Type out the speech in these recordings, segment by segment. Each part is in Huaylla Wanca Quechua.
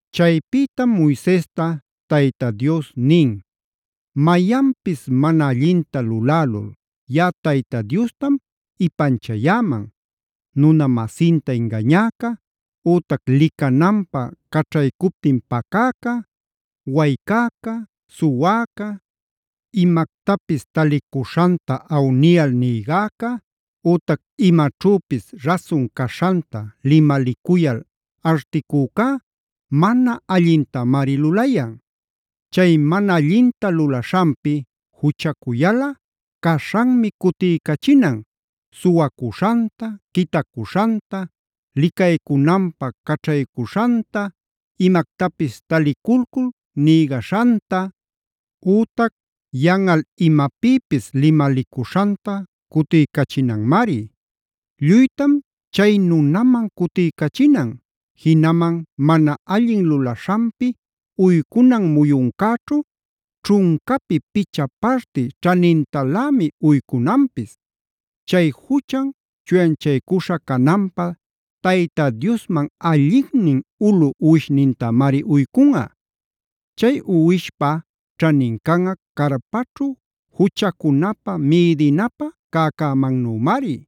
Chaypïtam Moisesta Tayta Diosmi nin: “Mayanpis mana allinta lulälul yaꞌa Tayta Diostam ipanchayäman: nuna-masinta ingañäca, ütac licananpä caćhaycuptin pacäca, waycäca, suwäca, imactapis talicuśhanta awniyal nïgäca, ütac imaćhüpis rasun caśhanta limalicuyal articücá mana allintamari lulayan. Chay mana allinta lulaśhanpi juchacuyalꞌa caśhanmi cutiycachinan: suwacuśhanta, quitacuśhanta, licaycunanpä caćhaycuśhanta, imactapis taliculcul nïgaśhanta, ütac yanꞌal imapïpis limalicuśhanta cutiycachinanmari. Lluytam chay nunaman cutiycachinan, jinaman mana allin lulaśhanpi uycunan muyuncäćhu ćhuncapi picha parti ćhanintalämi uycunanpis. Chay juchan chuyanchaycuśha cananpä Tayta Diosman allinnin ulu uwishnintamari uycunꞌa. Chay uwishpa ćhanin canꞌa carpaćhu juchacunapä mïdinapä cäcämannümari.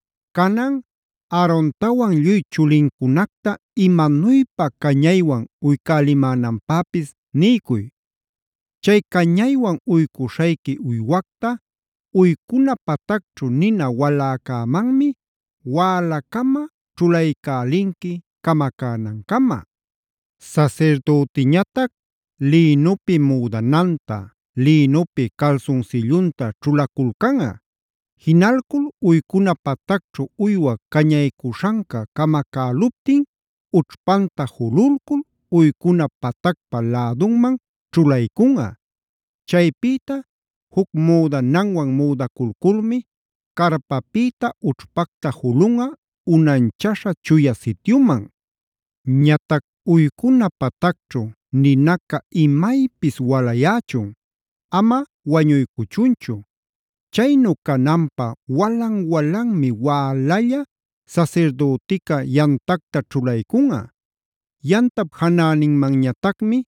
“Canan Aarontawan lluy chulincunacta imanuypa cañaywan uycälimänanpäpis niycuy: Chay cañaywan uycuśhayqui uywacta uycuna patacćhu nina waläcämanmi wälacama ćhulaycälinqui camacänancama. Sasirdütiñatac lïnupi müdananta, lïnupi calsunsillunta ćhulaculcunꞌa. Jinalcul uycuna patacćhu uywa cañaycuśhanca camacäluptin ućhpanta jululcul uycuna patacpa läduman ćhulaycunꞌa. Chaypïta juc müdananwan müdaculculmi carpapïta ućhpacta julunꞌa unanchaśha Chuya Sityuman. “Ñatac uycuna patacćhu ninaca imaypis walayächun; ama wañuycuchunchu. Chaynu cananpä walan-walanmi wälalla sasirdütica yamtacta ćhulaycunꞌa. Yamtap janäninmanñatacmi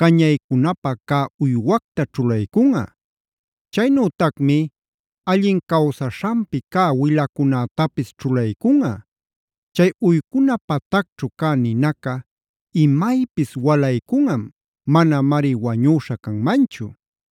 cañaycunapä cä uywacta ćhulaycunꞌa; chaynütacmi allin cawsaśhanpi cä wilacunätapis ćhulaycunꞌa. Chay uycuna patacćhu cä ninaca imaypis walaycunꞌam; manamari wañüśhä canmanchu.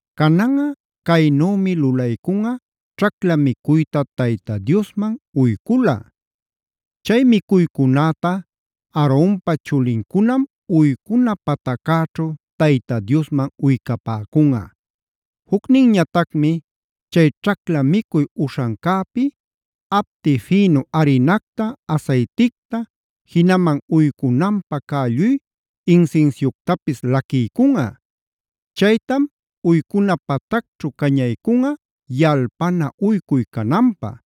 “Cananꞌa caynümi lulaycunꞌa ćhacla micuyta Tayta Diosman uyculꞌa. Chay micuycunäta Aaronpa chulincunam uycuna pataccäćhu Tayta Diosman uycapäcunꞌa. Jucninñatacmi chay ćhacla micuy uśhancäpi apti fïnu arinacta, asayticta, jinaman uycunanpä cä lluy insinsiuctapis laquiycunꞌa. Chaytam uycuna patacćhu cañaycunꞌa yalpana uycuy cananpä.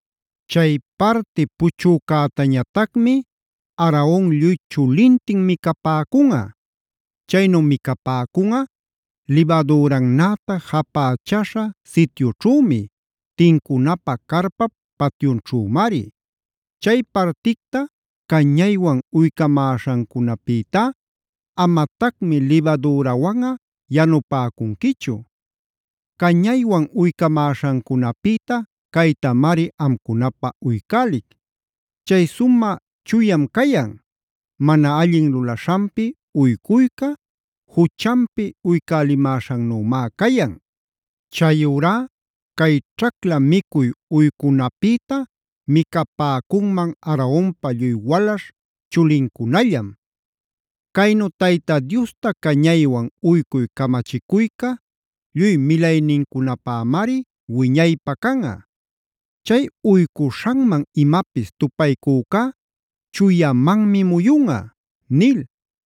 Chay parti puchücätañatacmi Aaron lluy chulintin micapäcunꞌa. Chaynu micapäcunꞌa libadürannäta japächäśha sityućhümi; tincunapä carpap patyunćhümari. Chay particta cañaywan uycamäśhancunapïtá amatacmi libadürawanꞌa yanupäcunquichu. Cañaywan uycamäśhancunapïta caytamari amcunapä uycälic. Chay sumä chuyam cayan, mana allin lulaśhanpi uycuyca, juchanpi uycälimäśhannümá cayan. Chayurá cay ćhacla micuy uycunapïta micapäcunman Aaronpa lluy walaśh chulincunallam. Caynu Tayta Diosta cañaywan uycuy camachicuyca lluy milaynincunapämari wiñaypä canꞌa. Chay uycuśhanman imapis tupaycücá chuyamanmi muyunꞌa” nil.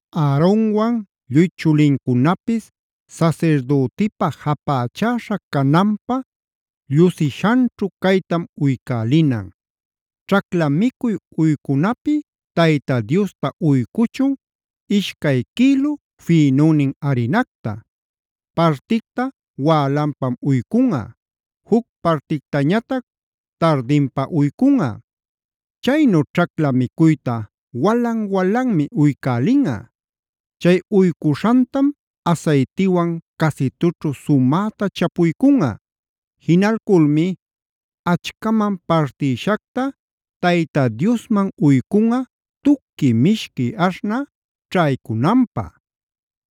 “Aaronwan lluy chulincunapis sasirdütipa japächäśha cananpä llusishanćhu caytam uycälinan: ćhacla micuy uycunapi Tayta Diosta uycuchun ishcay quïlu fïnunnin arinacta. Particta wälanpam uycunꞌa, juc partictañatac tardinpa uycunꞌa. Chaynu ćhacla micuyta walan-walanmi uycälinꞌa. Chay uycuśhantam asaytiwan casitućhu sumäta chapuycunꞌa. Jinalculmi achcaman partïshacta Tayta Diosman uycunꞌa tuqui mishqui aśhnä ćhaycunanpä.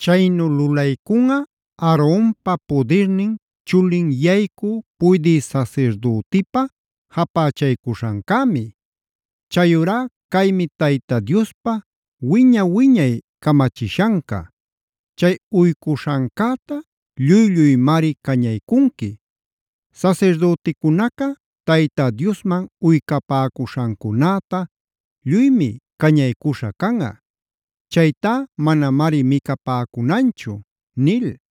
Chaynu lulaycunꞌa Aaronpa pudirnin chulin yaycü puydï sasirdütipa japächaycuśhancämi. Chayurá caymi Tayta Diospa wiña-wiñay camachishanca: chay uycuśhancäta lluy-lluymari cañaycunqui. Sasirdüticunaca Tayta Diosman uycapäcuśhancunäta lluymi cañaycuśha canꞌa. Chaytá manamari micapäcunanchu” nil.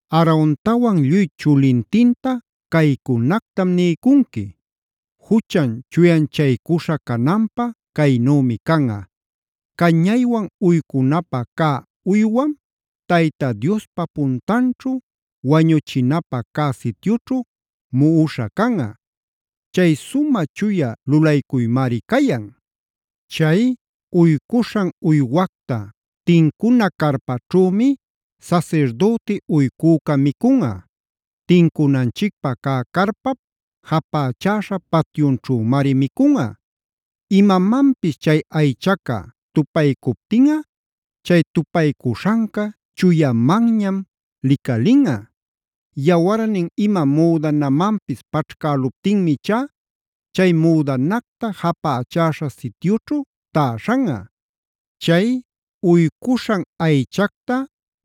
“Aarontawan lluy chulintinta caycunactam niycunqui: Juchan chuyanchaycuśha cananpä caynümi canꞌa: cañaywan uycunapä cä uywam Tayta Diospa puntanćhu, wañuchinapä cä sityućhu muꞌuśham canꞌa. Chay sumä chuya lulaycuymari cayan. Chay uycuśhan uywacta tincuna carpaćhümi sasirdüti uycüca micunꞌa; tincunanchicpä cä carpap japächäśha patyunćhümari micunꞌa. Imamanpis chay aychaca tupaycuptinꞌa chay tupaycuśhanca chuyamanñam licalinꞌa. Yawarnin ima müdanamanpis paćhcäluptinmi ichá chay müdanacta japächäśha sityućhu täśhanꞌa. Chay uycuśhan aychacta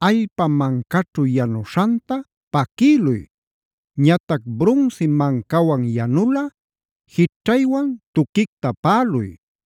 allpa mancaćhu yanuśhanta paquïluy. Ñatac brunsi mancawan yanulꞌa jićhcaywan tuquicta paꞌaluy.